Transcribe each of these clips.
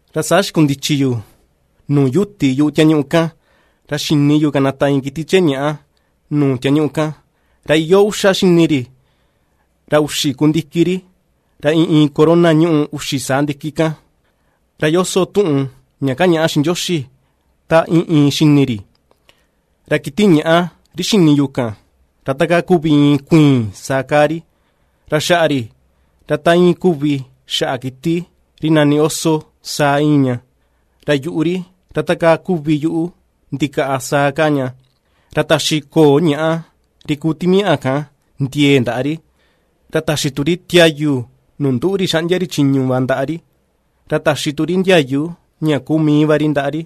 Ra saa xikundichi yu nuu yuti yuꞌu tiañuꞌu kan, ra xini yu kanata iin kiti chee ñàꞌa nuu tiañuꞌu kan, ra iyoo uxa xini ri, ra uxi ku ndiki ri, ra iin iin corona ñuꞌu uxi saa ndiki kan; ra ^yoso tuꞌun ña ^kañaꞌa xiꞌin Ndioxi ta iin iin xini ri. Ra kiti ñaꞌa ri xini yu kan, ra takaa kuvi iin kuiin saa kaa ri, ra xaꞌa ri, ra ta íin kuvi xaꞌa kiti ri nani oso saa íin ña, ra yuꞌu ri, ra ta kaa kuvi yuꞌu ndikaꞌa saa kaa ña, ra taxi ko̱o̱ ñàꞌa ri kuu timiaꞌa kan ndiee ndaꞌa ri, ra taxi tu ri tiayu nuu nduꞌu ri xaꞌndia ri chiñu va ndaꞌa ri, ra taxi tu ri ndiayu ña kuu mii va ri ndaꞌa ri.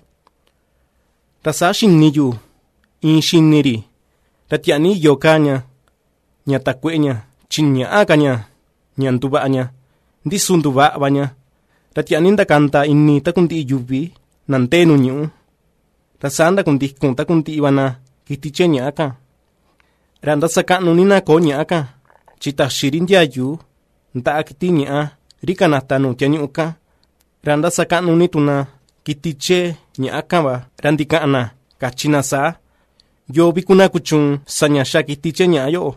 Ra saa xini yu iin xini ri, ra tiaa ní iyo kaa ña, ña takueꞌe ña, chi ñäꞌa ka ña, ña nduvaꞌa ña, ndi su nduvaꞌa va ña. Ra tiaa ni ndakanda ini takundiꞌi yuvi na ndee nuu ñuꞌú, ra saa ndakundikun takundiꞌi va na kiti chee ñaꞌa kan. Ra ^ndasakaꞌnu ní na ko̱o̱ ñàꞌa kan, chi taxi ri ndiayu ndaꞌa kiti ñaꞌa ri kanata nuu tiañuꞌu kan, ra ^ndasakaꞌnu ni tu na kiti chee ñaꞌa kan va, ra ndikaꞌan na kachi na saa: ―¿Yoo vi kuvi na kuchuun sa ña ^xa kiti chee ñaꞌa yoꞌo,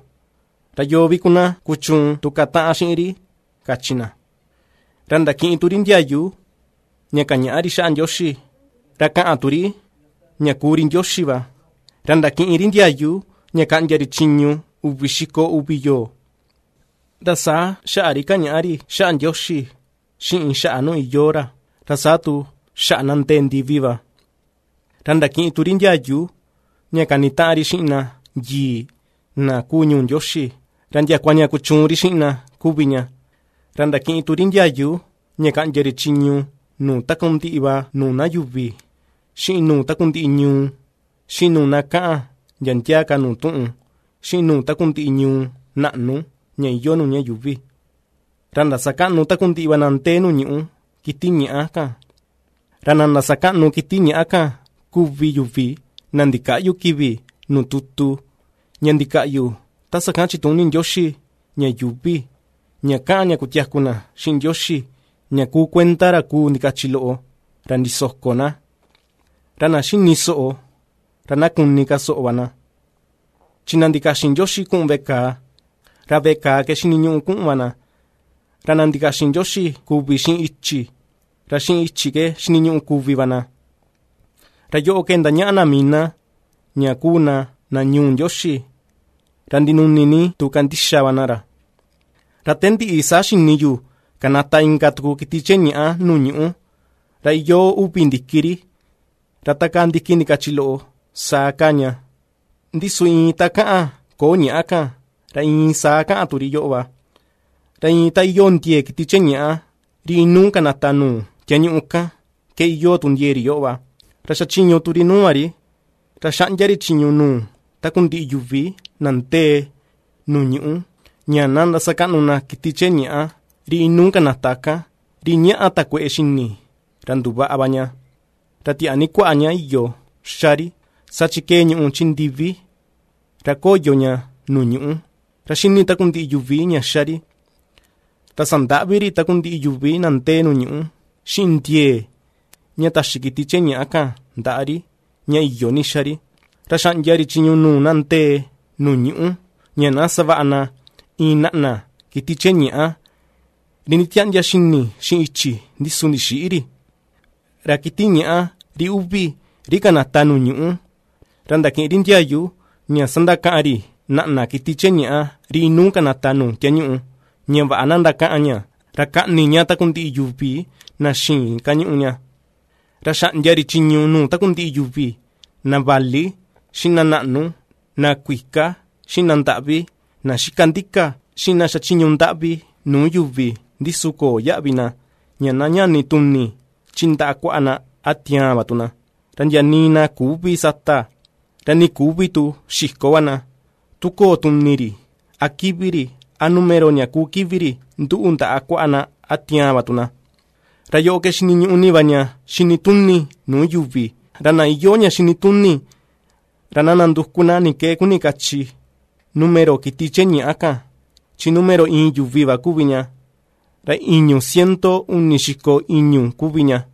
ra yoo vi kuvi na ^kuchuun tu kataꞌan xiꞌin ri? ―kachi na. Ra ndakiꞌin tu ri ndiayu ña kañaꞌa ri xaꞌa Ndioxi, ra kaꞌan tu ri ña kuu ri ndioxi va, ra ndakiꞌin ri ndiayu ña kaꞌndia ri chiñu, uvi xiko uvi yoo. Ra saa xaꞌa ri kañaꞌa ri xaꞌa Ndioxi, xiꞌin xaꞌa nuu iyoo ra, ra saa tu xaꞌa na ndee ndivi va. Ra ndakiꞌin tu ri ndiayu ña kanitaꞌan ri xiꞌin na yii na kuu ñuu Ndioxi, ra ndiakua ña kuchuun ri xiꞌin na kuvi ña, ra ndakiꞌin tu ri ndiayu ña kaꞌndia ri chiñu nuu takundiꞌi va nuu na yuvi, xiꞌin nuu takundiꞌi ñuu, xiꞌin nuu na kaꞌan ndia ndia ka nuu tuꞌun, xiꞌin nuu takundiꞌi ñuu naꞌnu ña iyoo nuu ña yuuvi. Ra ndasakaꞌnu takundiꞌi va na ndee nuu ñuꞌú kiti ñaꞌa kan; ra na ndasakaꞌnu kiti ñàꞌa kan kuvi yuvi na ndikäꞌyu kivi nuu tutu, ña ndikaꞌyu ta sakan chituni Ndioxi ña yuuvi; ña kaꞌan ña kutiaku na xiꞌin Ndioxi, ña kuu kuenda ra kuu ndikachi loꞌo, ra ndisoko na. Ra na ^xini soꞌo, ra na kuni ka soꞌo va na. Chi na ndikaxin Ndioxi kuꞌun veꞌe kàà, ra veꞌe kàà ke xiniñuꞌu kuꞌun va na; ra na ndikaxin Ndioxi kuvi xiꞌin ichi, ra xiꞌin ichi ke xiniñuꞌu kuvi va na. Ra yoꞌo ke ^ndañaꞌa na mii na ña kuu na na ñuu Ndioxi, ra ndinuni ni tu kandixa va na ra. Ra te ndiꞌi, saa xini yu kanata inka tuku kiti chee ñaꞌa nuu ñuꞌú. Ra iyoo uvi ndiki ri, ra takaa ndiki ndikachi loꞌo saa kaa ña, ndi su iin ta kaꞌan ko̱o̱ ñàꞌa kan, ra iin saa kaꞌan tu ri yoꞌo va. Ra iin ta iyoo ndiee kiti chee ñàꞌa, ri inuu kanata nuu tiañuꞌu kan, ke iyoo tu ndiee ri yoꞌo va, ra ^xachiñu tu ri nuu va ri, ra ^xaꞌndia ri chiñu nuu takundiꞌi yuvi na ndee nuu ñuꞌú, ña na ndasakaꞌnu na kiti chee ñàꞌa ri inuu kanata kan, ri ñàꞌa takueꞌe xi̱ni̱ ra nduvaꞌa va ña. Ra tiaa ni kuaꞌa ña iyo ^xa ri, saa chi ^kee ñùꞌù chi ndivi, ra ^koyo ña nuu ñuꞌú, ra ^xíní takundiꞌi yuvi ña ^xa ri. Ra sandaꞌvi ri takundiꞌi yuvi na ndee nuu ñuꞌú, xiꞌin ndiee ña taxi kiti chee ñàꞌa kan ndaꞌa ri ña iyo ni xa ri, ra xaꞌndia ri chiñu nuu na ndee nuu ñuꞌú, ña na savaꞌa na iin naꞌna kiti chee ñàꞌa, ri nditiaꞌndia xini xiꞌin ichi, ndi su ndixïꞌi ri. Ra kiti ñaꞌa ri uvi, ri kanata nuu ñuꞌú, ra ndakiꞌin ri ndiayu ña sandakaꞌan ri naꞌna kiti chee ñaꞌa ri inuu kanata nuu tiañuꞌu, ña vaꞌa na ndakaꞌan ña, ra kaꞌni ña takundiꞌi yuvi na xïin kañuꞌu ña. Ra xaꞌndia ri chiñu nuu takundiꞌi yuvi, na vali xiꞌin na naꞌnu, na kuika, xiꞌin na ndaꞌvi, na xika ndika, xiꞌin na xachiñu ndaꞌvi nuu yuvi ndi su köo yaꞌvi na, ña na ñani tuni chi ndaꞌa kuaꞌa na, a tiaan va tu na. Ra ndia nii na küvi sata, ra nii küvi tu xiko va na, tu köo tuni ri, a kivi ri, a numero ña kúú kivi ri, nduꞌu ndaꞌa kuaꞌa na, a tiaan va tu na. Ra yoꞌo ke xiniñuꞌu ní va ña xini tuni nuu yuvi, ra na iyoo ña xini tuni ra na nanduku na ni ke kuni kachi numero kiti chee ñaꞌa kan, chi numero iin yuvi va kuvi ña, ra i̱ñu̱ ciento uni xiko i̱ñu̱ kuvi ña.